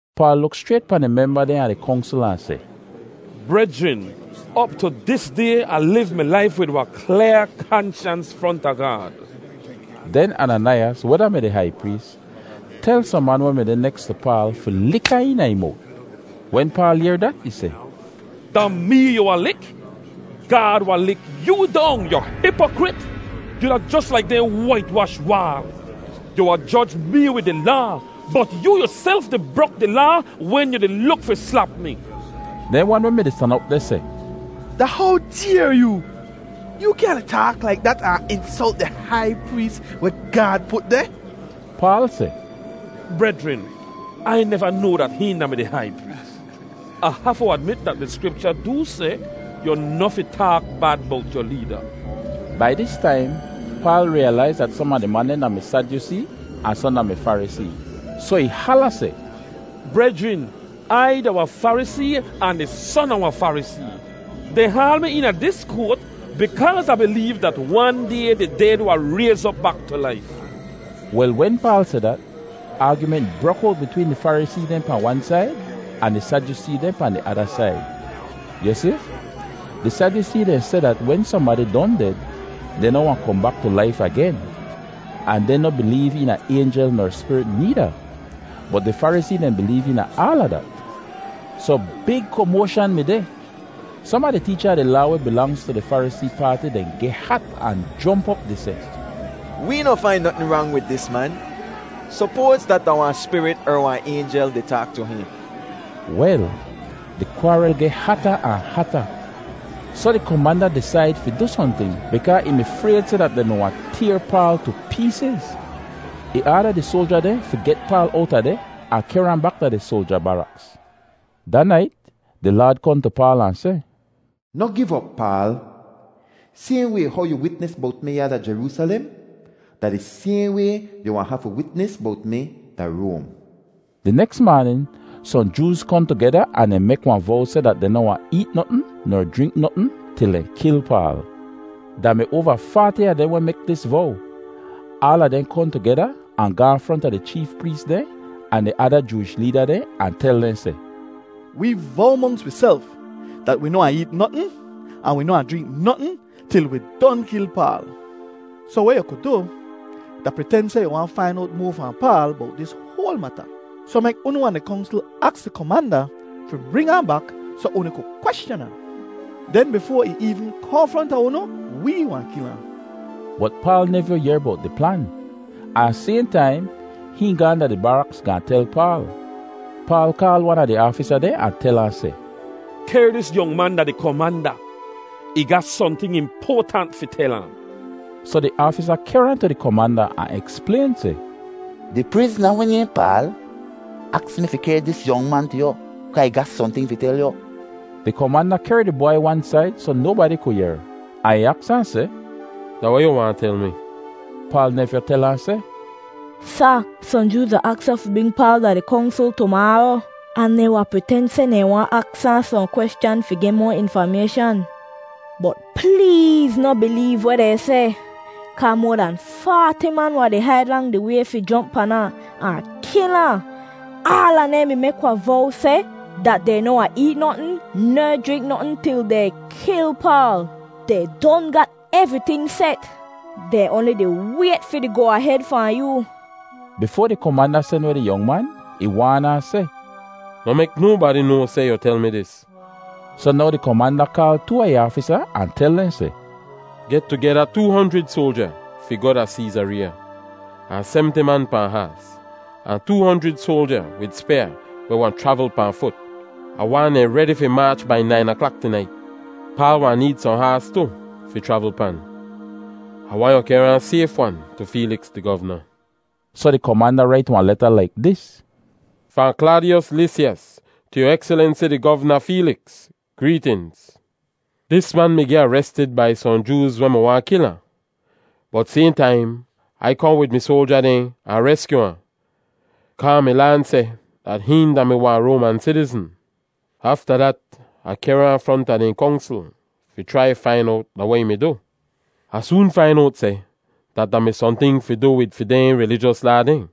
Paal luk schrayt pahn di memba dehn a di Kongsl ahn seh, “Brejrin, op tu dis day Ah liv mi laif wid wahn klyaa kanshans fronta Gaad.” Den Ananaiyas, weh da-mi di hai prees, tel sohn man weh mi deh neks tu Paal fi lik ahn eena ih mowt. Wen Paal yehr dat, ih seh, “Da mee yu wahn lik? Gaad wahn lik yoo dong, yu hipokrit. Yu da jos laik dehn wait-wash waal. Yu wahn joj mee wid di Laa, bot yoo yuself di brok di Laa wen yu di luk fi slap mi.” Dehn wan weh mi-di stan op deh seh, “Da how dayr yoo? Yoo kyaahn di taak laik dat ahn insolt di hai prees weh Gaad put deh.” Paal seh, “Brejrin, Ai neva noa dat hihn da-mi di hai prees. Ah hafu admit dat di Skripcha doo seh, ‘Yu noh fi taak bad bowt yu leeda.’” Bai dis taim, Paal riyalaiz dat som a di man dehn da-mi Sadyusee ahn sohn da-mi Farisee. Soh ih hala seh, “Brejrin, Ai da wahn Farisee ahn di son a wahn Farisee. Dehn haal mi eena dis koat bikaaz Ah bileev dat wan day di ded wahn rayz op bak tu laif.” Wel, wen Paal seh dat, aagyument brok owt bitween di Farisee dehn pahn wan said, ahn di Sadyusee dehn pahn di ada said. Yu si, di Sadyusee dehn seh dat wen sohnbadi don ded, dehn noh wahn kohn bak tu laif agen. Ahn dehn noh bileev eena aynjel ner spirit needa. Bot di Farisee dehn bileev eena aala dat. Soh big komoashan mi deh. Som a di teecha a di Laa weh bilangz tu di Farisee paati dehn geh hat ahn jomp op di seh, “Wee noh fain notn rang wid dis man. Sopoaz dat da wahn spirit er wahn aynjel di taak tu hihn.” Wel, di kwaaril geh hata ahn hata, soh di komanda disaid fi du sohnting bikaa ih mi frayd seh dat dehn mi wahn tayr Paal tu peesiz. Ih aada di soalja dehn fi get Paal owta deh ahn kehr ahn bak da di soalja baraks. Da nait, di Laad kohn tu Paal ahn seh, “Noh giv op, Paal. Sayhn way how yu witnis bowt mi ya da Jeroosalem, da di sayhn way yu wahn hafu witnis bowt mi da Roam.” Di neks maanin, sohn Jooz kohn tugeda ahn dehn mek wahn vow seh dat dehn noh wahn eet notn ner jrink notn til dehn kil Paal. Da mi oava faati a dehn weh mek dis vow. Aala dehn kohn tugeda ahn gaahn fronta di cheef prees dehn ahn di ada Jooish leeda dehn ahn tel dehn seh, “Wee vow monks wiself dat wi noh wahn eet notn ahn wi noh wahn jrink notn til wi don kil Paal. Soh weh yu ku du, da priten seh yu waahn fain owt moa fahn Paal bowt dis hoal mata, soh mek unu ahn di Kongsl aks di komanda fi bring ahn bak soh unu ku kweschan ahn. Den bifoa ih eevn kohn fronta unu, wee wahn kil ahn.” Bot Paal nevyoo yehr bowt di plan, ahn sayhn taim hihn gaahn da di baraks gaahn tel Paal. Paal kaal wan a di aafisa dehn ahn tel ahn seh, “Kehr dis yong man da di komanda. Ih ga sohnting impoatant fi tel ahn.” Soh di aafisa kehr ahn tu di komanda ahn eksplayn seh, “Di prizna weh nayhn Paal aks mi fi kehr dis yong man tu yu kaa ih ga sohnting fi tel yu.” Di komanda kehr di bwai wan said soh nobadi ku yehr, ahn ih aks ahn seh, “Da weh yu waahn tel mi?” Paal nevyoo tel ahn seh, “Sa, sohn Jooz wahn aks yu fi bring Paal da di Kongsl tumaaro ahn dehn wahn priten seh dehn waahn aks ahn sohn kweschan fi geh moa infamayshan. Bot pleez noh bileev weh dehn seh, kaa moa dan faati man wahn di haid lang di way fi jomp pan ahn, ahn kil ahn. Aala dehn mi mek wahn vow seh dat dehn noh wahn eet notn ner jrink notn til dehn kil Paal. Dehn don gat evriting set; dehn oanli di wayt fi di goa-ahed fahn yoo.” Bifoa di komanda sen weh di yong man, ih waan ahn seh, “Noh mek nobadi noa seh yu tel mi dis.” Soh now di komanda kaal too a ih aafisa ahn tel dehn seh, “Get tugeda too honjrid soalja fi goh da Seezareeya, ahn semti man pahn haas, ahn too honjrid soalja wid spyaa weh wahn chravl pahn fut. Ah waahn dehn redi fi maach bai nain aklak tunait. Paal wahn need sohn haas tu fi chravl pan. Ah waahn yu kehr ahn sayf-wan tu Feeliks, di govna.” Soh di komanda rait wahn leta laik dis: “Fahn Klaadiyos Lisyas tu yu Ekselensi di Govna Feeliks: Greetinz. Dis man mi geh arestid bai sohn Jooz weh mi wahn kil ahn, bot sayhn taim Ai kohn wid mi soalja dehn ahn reskyu ahn, kaa Ah mi laan seh dat hihn da-mi wahn Roaman sitizn. Afta dat, Ah kehr ahn fronta dehn Kongsl fi chrai fain owt da weh ih mi du. Ah soon fain owt seh dat da mi sohnting fi du wid fi dehn rilijos laa dehn.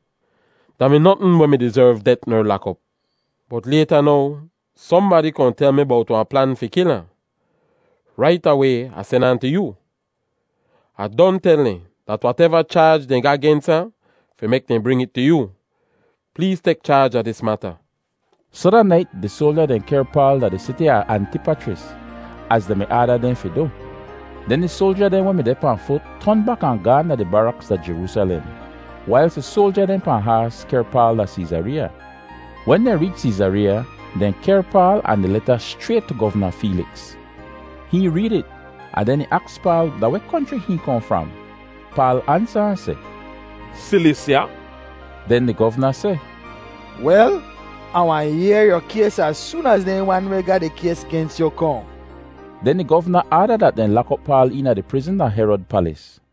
Da mi notn weh mi dizerv det ner lak op. Bot layta now, sohnbadi kohn tel mi bowt wahn plan fi kil ahn. Rait away Ah sen ahn tu yoo. Ah don tel dehn dat wateva chaaj dehn ga gens ahn, fi mek dehn bring it tu yoo. Pleez tek chaaj a dis mata.” Soh da nait di soalja dehn kehr Paal da di siti a Antipachris, az dehn mi aada dehn fi du. Den di soalja dehn weh mi deh pahn fut ton bak ahn gaahn bak da di baraks da Jeroosalem, wailz di soalja dehn pahn haas kehr Paal da Seezareeya. Wen dehn reech Seezareeya, dehn kehr Paal ahn di leta schrayt tu Govna Feeliks. Hihn reed it ahn den ih aks Paal da weh konchri hihn kohn fram. Paal ansa ahn seh, “Silisya.” Den di govna seh, “Wel, Ah wahn yehr yu kays az soon az dehn wan weh ga di kays gens yu kohn.” Den di govna aada dat dehn lak op Paal eena di prizn da Herod palis.